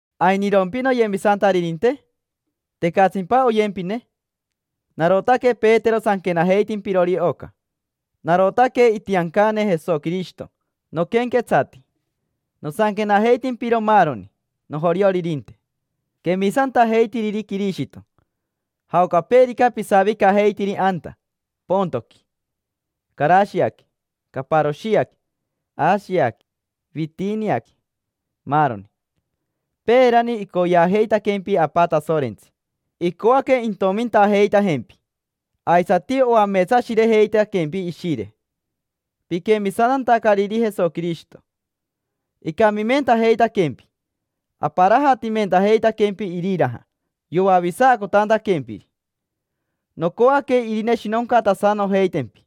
¿Ainirompi noyemisantaririnte? ¿Tecatsimpa oyempine? Narotaque Petero sanquenajeitimpirori oca. Narotaque itiancane Jesoquirishito noquenquetsati. Nosanquenajeitimpiro maaroni nojorioririnte, quemisantajeitiriri Quirishito, jaocapeerica pisavicajeitiri anta Pontoqui, Carashiaqui, Caparoshiaqui, Ashiaqui, Vitiniaqui, maaroni. Peerani icoyeajeitaquempi Apa Tasorentsi, icoaque intomintajeitajempi. Aisati oameetsashirejeitaquempi Ishire piquemisantantacariri Jesoquirishito: icamimentajeitaquempi, aparajatimentajeitaquempi iriraja yoavisacotantaquempiri. Nocoaque irineshinoncatasanojeitempi,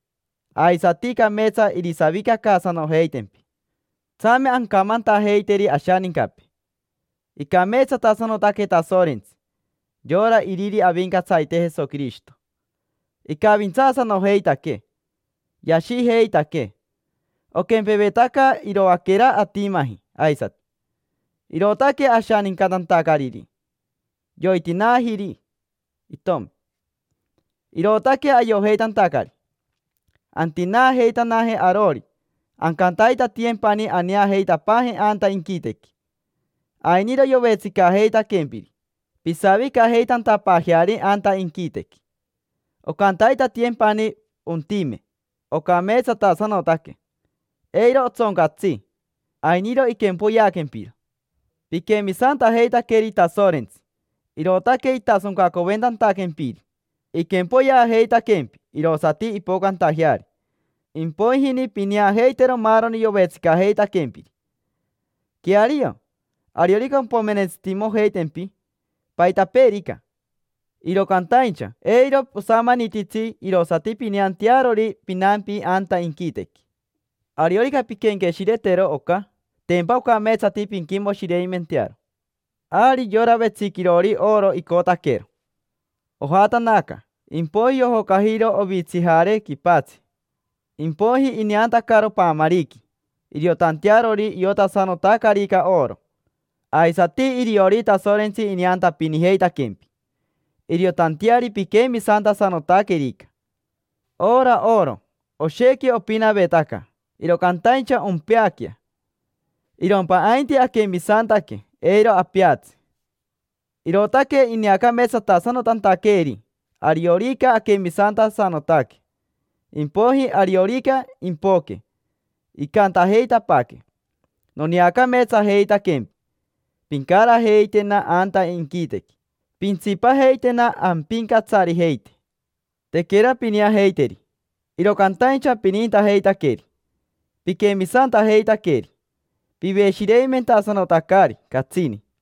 aisati cameetsa irisavicacaasanojeitempi. Tsame ancamantajeiteri ashanincapee: “Icameetsatasanotaque Tasorentsi: yora Iriri Avincatsarite Jesoquirishito”. Icavintsaasanojeitaquee, yashijeitaquee: oquempevetaca iroaquera atimaji aisati, irootaque ashanincatantacariri. Yoitinaajiri itomi, irootaque ayojeitantacari antinaajeitanaje arori, ancantaitatiyempani aneajeitapaaje anta inquitequi. Ainiro yovetsicajeitaquempiri pisavicajeitantapaajeari anta inquitequi. Oncantaitatiyempani ontime, ocameetsatasanotaque, eiro otsoncatsi, ainiro iquempoyeaquempiro. Piquemisantajeitaqueri Tasorentsi, irootaque itasoncacoventantaquempiri; iquempoyeajeitaquempi irosati impocantajeari. Impoijini pineajeitero maaroni yovetsicajeitaquempiri. Queario, ariorica ompomerentsitimojeitempi paitapeerica, iro cantaincha eiro osamanititsi irosati pineantearori pinampi anta inquitequi. Ariorica pinquenqueshiretero oca, tempa ocameetsati pinquimoshireimentearo. Ari yora vetsiquirori oro icotaquero, ojatanaca, impoiji yojocajiro ovitsijare quipatsi. Impoiji ineantacaro paamariqui, iriotantearori iotasanotacarica oro. Aisati iriori Tasorentsi ineantapinijeitaquempi iriotanteari piquemisantasanotaquerica. Ora oro, oshequi opinavetaca, iro cantaincha ompeaquea; irompa ainti aquemisantaque, eiro apeatsi. Irootaque ineacameetsatasanotantaqueeri, ariorica aquemisantasanotaque. Impoiji, ariorica impoque, incantajeitapaaquee: “Noneacameetsajeitaquempi: pincarajeitena anta inquitequi, pintsipajeitena ampincatsarijeite”. Tequera pineajeiteri, iro cantaincha pinintajeitaqueri, piquemisantajeitaqueri, piveshireimentasanotacari catsini.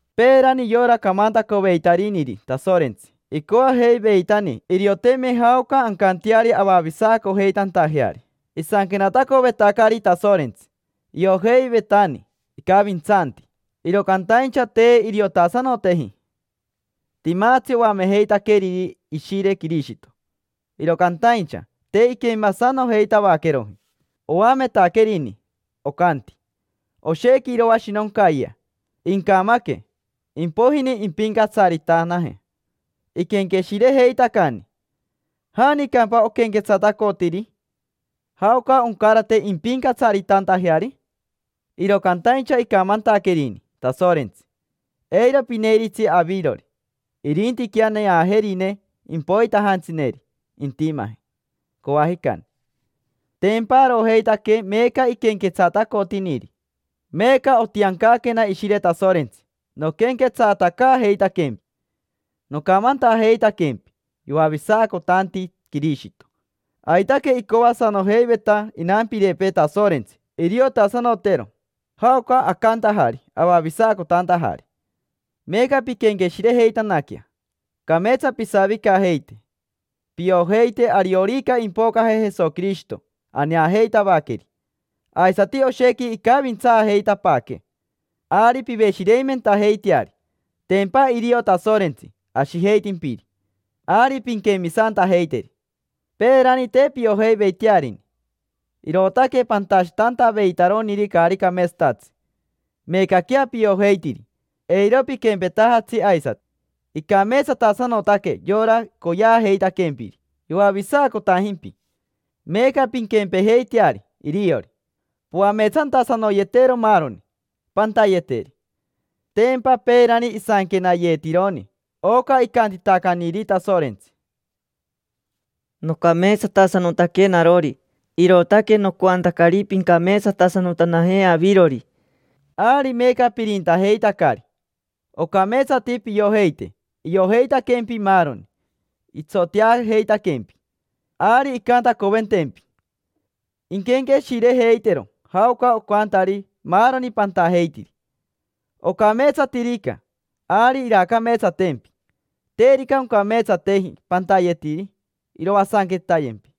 Peerani yora camantacoveitariniri Tasorentsi icoajeiveitani irioteme jaoca ancanteari avavisacojeitantajeari. Isanquenatacovetacari Tasorentsi, iojeivetani icavintsanti, iro cantaincha te iriotasanoteji. Timatsi oamejeitaqueriri Ishire Quirishito, iro cantaincha te inquemasanojeitavaqueroji. Oametaquerini, ocanti: “Oshequi iroashinoncayea, incamaque; impoijini impincatsaritanaje”. Iquenqueshirejeitacani: “¿Janicampa oquenquetsatacotiri? ¿Jaoca oncarate impincatsaritantajeari?” Iro cantaincha icamantaquerini Tasorentsi: “Eiro pineiritsi avirori, irintiquea neajerine impoitanajantsineri intimaje coajicani”. Tempa arojeitaque meeca iquenquetsatacotiniri. Meeca otiancaquena Ishire Tasorentsi noquenquetsatacaajeitaquempi, nocamantajeitaquempi yoavisacotanti Quirishito. Aitaque icoasanojeiveta inampirepee Tasorentsi iriotasanotero jaoca acantajari avavisacotantajari. Meeca pinquenqueshirejeitanaquea, cameetsa pisavicajeite. Piojeite ariorica impocaje Jesoquirishito aneajeitavaqueri, aisati oshequi incavintsaajeitapaaquee; ari piveshireimentajeiteari. Tempa irio Tasorentsi ashijeitimpiri. Ari pinquemisantajeiteri. Peerani te piojeiveitearini, irootaque pantashitantaveitaroniri caari cameetsatatsi. Meecaquea piojeitiri: eiro piquempetajatsi aisati. Icameetsatasanotaque yora coyeajeitaquempiri yoavisacotajimpi: meeca pinquempejeiteari iriori, poameetsantasanoyetero maaroni pantayeteri. Tempa peerani isanquenayeetironi oca icantitacaniri Tasorentsi: “Nocameetsatasanotaque narori, irootaque nocoantacari pincameetsatasanotanaje avirori”. Ari meeca pirintajeitacari: ocameetsati piojeite iojeitaquempi maaroni, itsoteajeitaquempi. Ari incantacoventempi, inquenqueshirejeitero jaoca ocantari maaroni pantajeitiri. Ocameetsatirica, ari iraacameetsatempi. Terica oncameetsateji pantayetiri, iroasanquetayempi.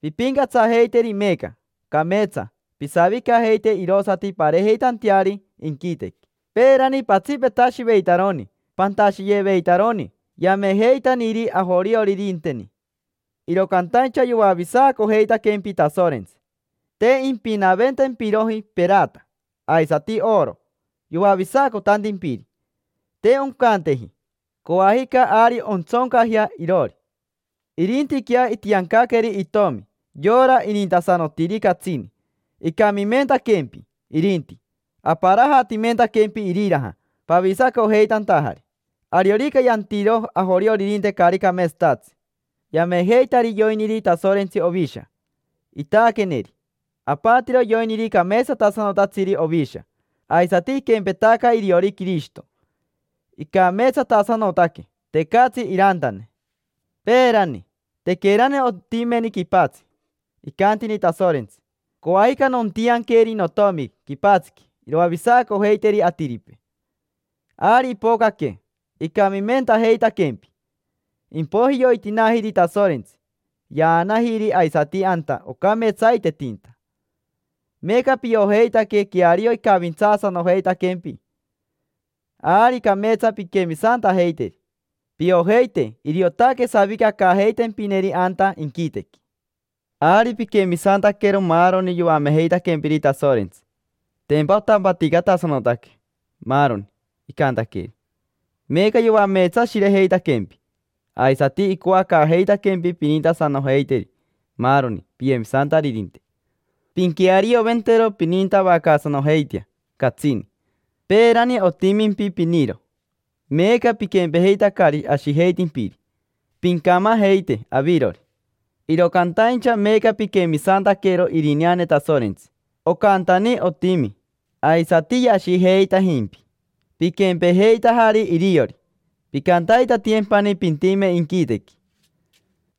Pimpincatsajeiteri meeca, cameetsa pisavicajeite irosati pareejeitanteari inquitequi. Peerani patsipetashiveitaroni pantashiyeveitaroni yamejeitaniri ajorioririnteni, iro cantaincha yoavisacojeitaquempi Tasorentsi. Te impinaventempiroji perata aisati oro yoavisacotantimpiri. Te oncanteji, coajica ari ontsoncajea iroori. Irintiquea itiancaqueri itomi, yora inintasanotiri catsini. Icamimentaquempi irinti, aparajatimentaquempi iriraja pavisacojeitantajari. Ariorica yantiro ajorioririnte caari cameetsatatsi, yamejeitari yoiniri Tasorentsi ovisha, itaaqueneri. Apatiro yoiniri cameetsatasanotatsiri ovisha. Aisati iquempetaca iriori Quirishito, icameetsatasanotaque: tecatsi irantane. Peerani, tequerani ontimeni quipatsi, icantini Tasorentsi: “Coajica nontianqueri notomi quipatsiqui iroavisacojeiteri atiripee”. Ari ipocaque, icamimentajeitaquempi, impoiji yoitinaajiri Tasorentsi, yaanajiri aisati anta ocameetsaitetinta. Meeca piojeitaque queario icavintsaasanojeitaquempi, ari cameetsa pinquemisantajeiteri, piojeite iriotaque savicacaajeitempineri anta inquitequi. Ari piquemisantaquero maaroni yoamejeitaquempiri Tasorentsi, tempa otampaticatasanotaque maaroni icantaqueri. Meeca yoameetsashirejeitaquempi, aisati icoacaajeitaquempi pinintasanojeiteri maaroni piyemisantaririnte. Pinquearioventero, pinintavacaasanojeitea catsini. Peerani otimimpi piniro, meeca piquempejeitacari ashijeitimpiri, pincamajeite avirori. Iro cantaincha meeca piquemisantaquero irineane Tasorentsi, ocantani otimi. Aisati yashijeitajimpi, piquempejeitajari iriori: pincantaitatiyempani pintime inquitequi.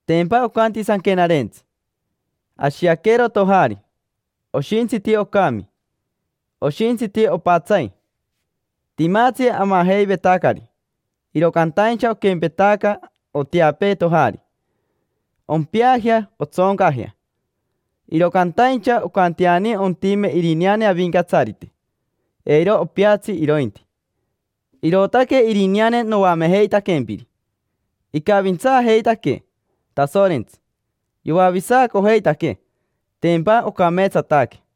Tempa ocanti Sanquenarentsi: “Ashiaquero tojari: oshintsiti ocami, oshintsiti opatsai. Timatsi amajeivetacari, iro cantaincha oquempetaca oteapee tojari: ompeajea, ontsoncajea. Iro cantaincha oncanteani ontime irineane Avincatsarite: eiro opeatsi irointi”. Irootaque irineane noamejeitaquempiri: icavintsaajeitaquee Tasorentsi, yoavisacojeitaquee. Tempa ocameetsataque.